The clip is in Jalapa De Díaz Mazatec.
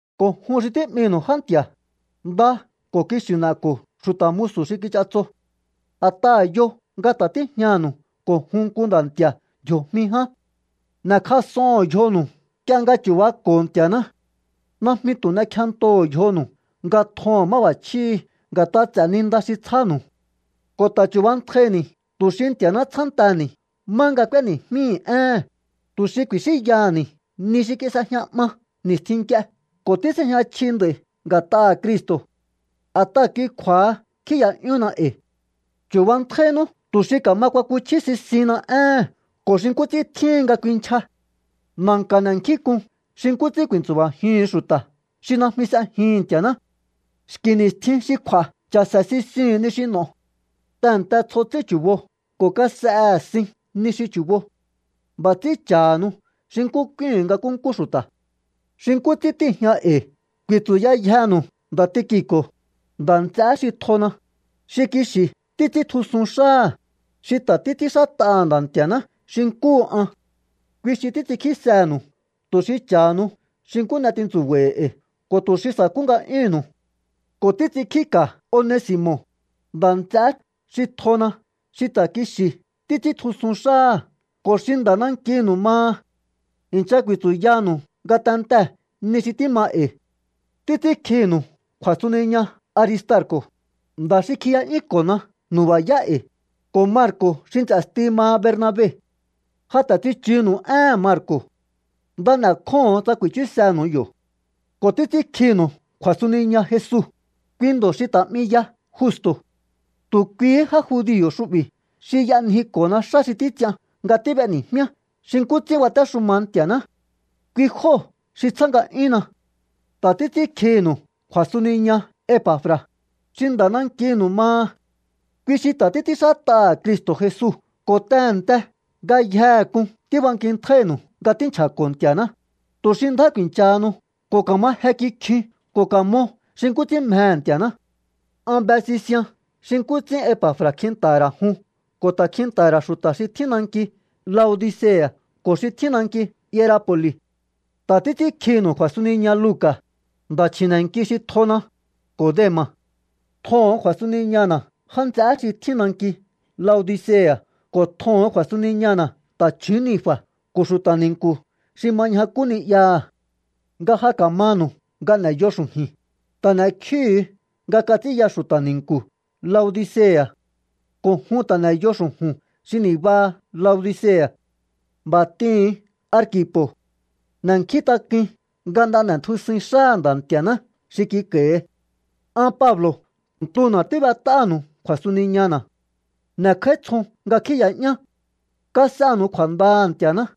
Ko̱ jun xi tí'minu̱u já nti̱a̱, nda ko̱ kixi̱ n'e̱ko̱o xu̱ta̱ musu̱ xi kich'atso. A̱t'aha̱ yo nga ta̱ tíjñanu̱u ko̱ jun nku Nda̱ Nti̱a̱ ndji̱o̱jmi ján. N'e̱kjas'oho̱on yjonu̱u nk'ie nga chu̱bako̱o Nti̱a̱ná. Najmi tu̱ n'ekjentoho̱o yjonu̱u nga tjoho̱on máb'a̱chjíhi̱ nga̱t'a ts'e̱ ni nda xi tsjánu̱u. Ko̱ ta̱ chu̱bantjaini̱ tu̱ xi Nti̱a̱ná tsjánteni̱ má nga k'úéni̱jmíi̱ éhe̱n, tu̱ xi ku̱i̱xínyaha̱ni̱ ni xi kis'ejña 'ma ni̱stjin nk'ie ko̱ tís'ejña chji nd'a̱i̱ nga̱t'aha̱ Cristo. A̱t'aha̱ kui kju̱a̱ha kjíi̱ya'yúhunna e̱i̱. Chu̱bantjainú tu̱ xi ka̱ma kuakuchjí sisihinna éhe̱n ko̱ xi nkú ts'ín tjíhin nga kuinchja. Na̱nka̱ n'e̱kjínk'un xi nkú ts'ín ku̱i̱ntsu̱ba̱jihu̱un xu̱ta̱ xi najmi s'ejihi̱n Nti̱a̱ná. Xki̱ ni̱stjin xi kju̱a̱ cha̱se̱ sisihu̱un ni xi n'o̱o. Tehe̱nte tsjo ts'ín chu̱bo ko̱ kas'ehe̱ sin ni xi chu̱bo. B'a̱ ts'ín cha̱hanu xi nkú k'úíhu̱un nga nkúnkú xu̱ta̱. Xi nkú ts'ín tíi̱jña e̱i̱ ku̱i̱tsu̱yayjenu̱u nda̱ Tiki̱ko̱, nda̱ nts'eé xi tjona, xi kixi̱ títs'íntjusun xáha̱, xi ta̱ títs'ínxát'aha̱ Nda̱ Nti̱a̱ná xi nkúhu an. Kui xi títs'inkjísenu̱u tu̱ xi cha̱hanu xi nkú n'e tintsu̱ba̱i̱ e̱i̱ ko̱ tu̱ xi sa̱kú nga'yúhu̱nnu̱u. Ko̱ títs'inkjíka̱ Onesi̱mo̱, nda̱ nts'eé xi tjona̱ xi ta̱ kixi̱ títs'íntjusun xáha̱ ko̱ xi nda̱ nankinu̱u maha. I̱ncha ku̱i̱tsu̱yanu̱u ngatentee̱ ni xi tíma e̱i̱. Títs'ínkjinu̱u kju̱a̱suniña Aristarko̱, nda̱ xi kjiya'yúnko̱na nu̱ba̱yá e̱i̱, ko̱ Marko̱ xi nts'e̱sti maha Bernabe. Ja ta̱ tsichunu̱u éhe̱n Marko̱. Nda n'e̱kjóho̱on tsa ku̱i̱chúsenu̱u yo̱. Ko̱ títs'ínkjinu̱u kju̱a̱suniña Jesu, kui ndo̱ xi ta̱ 'mi ya Justo̱. Tu̱ kuihí já judio̱ xu'bi̱ xi y'anjiko̱na xá xi títs'ian nga tíb'eni̱jmíá xi nkú ts'ín batéxuma Nti̱a̱ná. Kui jóo̱ xi tsjá nga'yúnna. Ta̱ títs'ínkjinu̱u kju̱a̱suniña Epa̱fra̱, xi nda̱ nankinu̱u maha. Kui xi ta̱ títs'ínxát'aha̱ Cristo̱ Jesu ko̱ tehe̱nte ngayjehe k'un tíbankintjáínu̱u nga tínchja̱ko̱ Nti̱a̱ná, tu̱ xi ndjá ku̱i̱nchahanu ko̱ ka̱ma je kikjiun ko̱ ka̱mo xi nkú ts'ín mjehe̱ Nti̱a̱ná. An be sisian xi nkú ts'ín Epa̱fra̱ kjinta̱ha̱ ra̱ jun ko̱ ta̱ kjinta̱ha̱ ra̱ xu̱ta̱ xi tjín nanki Laodicea̱ ko̱ xi tjín nanki Hierapo̱li̱. Ta̱ títs'ínkjinu̱u kju̱a̱suniña Luca̱, nda̱ chji̱ne̱nki xi tjona, ko̱ Dema̱. Tjoho̱on kju̱a̱suniñana̱ já nts'eé xi tjín nanki Laodicea̱ ko̱ tjoho̱on kju̱a̱suniñana̱ ta̱chju̱ún Ninfa̱ ko̱ xu̱ta̱ ni̱nku̱ xi ma ñjakú ni'yaha̱. Nga ja ka̱manu̱u nga n'e̱yo xu̱ju̱i̱n, ta̱ n'e̱kjíhu̱u nga kats'ínya xu̱ta̱ ni̱nku̱ Laodicea̱. Ko̱ jun ta̱ n'e̱yo xu̱ju̱n xi ni̱baha Laodicea̱. B'a̱ t'ihu̱un Arkipo̱: “N'e̱nkjíntak'uin nga nda n'e̱tjusuin xáha̱ Nda̱ Nti̱a̱ná xi kik'a̱i̱hi.” An Pablo̱ ntuna̱ tíb'et'áha̱nu̱u kju̱a̱suniñana̱. N'e̱kj'áítsjon nga kjíi̱ya'yán. Kas'enu̱u kju̱a̱ndaha̱ Nti̱a̱ná.